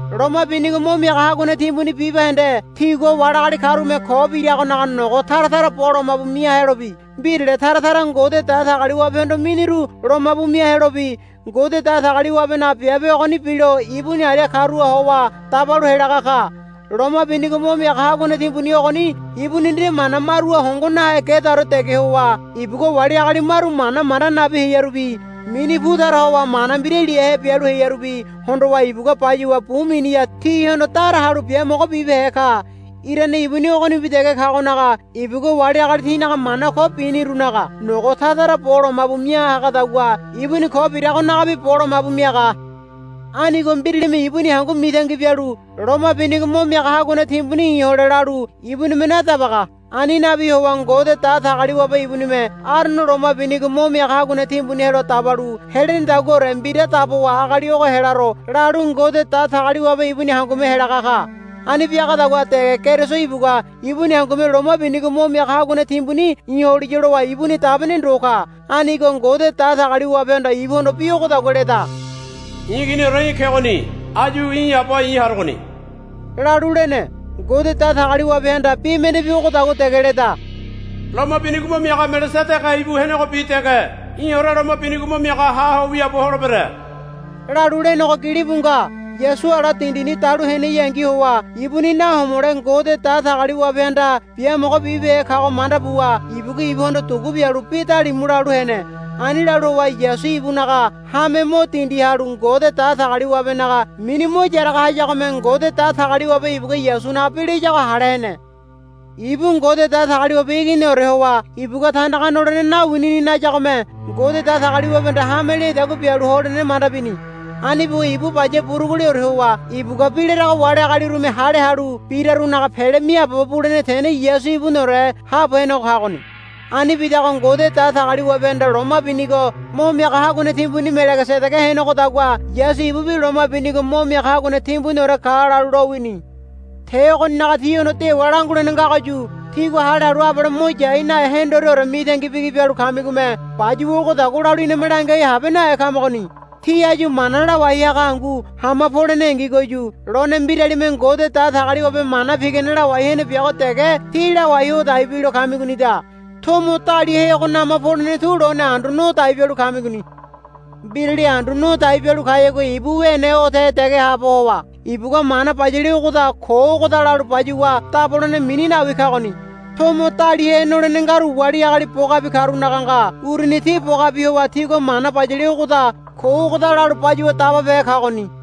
Loma binigo mo miaga haguane timbuni bibahende tigua wali agali karume ko biragonaga nogo tara tara bo lomabu mia helobi mbirale tara tara Ngode Datagaliwabehondo miniru lomabu mia helobi Ngode Datagaliwabenaga biabe ogoni bilo ibuni aria karuha howa dabalu helaga ka. Loma binigo mo miaga haguane timbuni ogoni ibuni nde mana maruha hongo nahe gedaore dege howa ibugua wali agali maru mana manda nabi hearubi mini pu tara howa mana mbira liahe bialu hearubi hondowa ibugua bayuwa bu miniha tihondo dara halu biamogo bibehe ka. Irane ibuni ogonibi dege kagonaga ibugua wali agali tinaga mana ko binirunaga nogo tara tara bo lomabu mia hagadagua ibuni ko biragonagabi bo lomabu miaga. Anigo mbiralime ibuni hangu mitangi bialu, Loma binigo mo miaga haguane timbuni i̱ hole, lalu ibunime nadabaga. Ani nabi howa Ngode Datagaliwabe ibunime Arono loma binigo mo miaga haguane timbuni helo dabalu helenedaguaore mbira dabowa agali ogo helaro lalu Ngode Datagaliwabe ibuni hangume helaga ka. Ani biagadagua dege Keriso ibugua ibuni hangume loma binigo mo miaga haguane timbuni i̱ holiya lowa ibuni dabene ndo ka. Anigo Ngode Datagaliwabehanda ibuhondo bi ogodagua leda, I̱ iginiore í̠ kegoni. Áyu í̠ Aba i̱ harogoni, lalu lene. Ngode Datagaliwabehanda bi mendebi ogodagua dege leda, Loma binigo mo miaga Melegesedege ibu henegobi dege í̠ore loma binigo mo miaga haho wiaabo holebere, lalu lenego gilibu nga. Yasu ala dindini dalu heneyangi howa ibuni nahomole Ngode Datagaliwabehanda biamogo bibehe kago manda buwa ibugua ibuhondo dugu bialu bi dalimu lalu hene. Ani lalu howa Yasu ibunaga hame mo dindiha halu Ngode Datagaliwabenaga mini mo yaraga hayagome Ngode Datagaliwabe ibugua Yasunaga bi layago hale hene. Ibu Ngode Datagaliwabe Iginiore howa ibugua tandaga nolene nawinini nayagome Ngode Datagaliwabehanda hame leadagua bialu holene manda bini. Ani buwa ibu baya buruguleore howa ibugua bi larago wali agalirume hale halu birarunaga pele miaabobo bulene tene Yasu ibuniore haabo henego kagoni. Ani bidago Ngode Datagaliwabehanda loma binigo mo miaga haguane timbuni Melegesedege henegodagua Yasu ibubi loma binigo mo miaga haguane timbuniore ka lalu lowini. Te ogoninaga tíhondo dewa langulene ngagoyu tígua hale halu abale mo yai nahe hendoreore mitangi bigi bialu kamigome bayuwa ogodagua lalu iname langiai habe nahe kamagoni. Tí áyu mana lawai haga hangu hama polenengigoyu lone mbiralime Ngode Datagaliwabe mana pigane lawai hene biago dege tí lawai ho dai bilo kamigonida. Tomo daliahego nama polene tu lone andu no dai bialu kamigoni. Mbirali andu no dai bialu kayagua ibu wene odahe dege haabo howa ibugua mana bayale ogoda ko ogoda lalu bayuwa dabolene mini nawi kagoni. Tomo daliahe nolene ngaru wali agali bogabi karunaga nga. Uruni ti bogabi howa tigua mana bayale ogoda ko ogoda lalu bayuwa dababehe kagoni.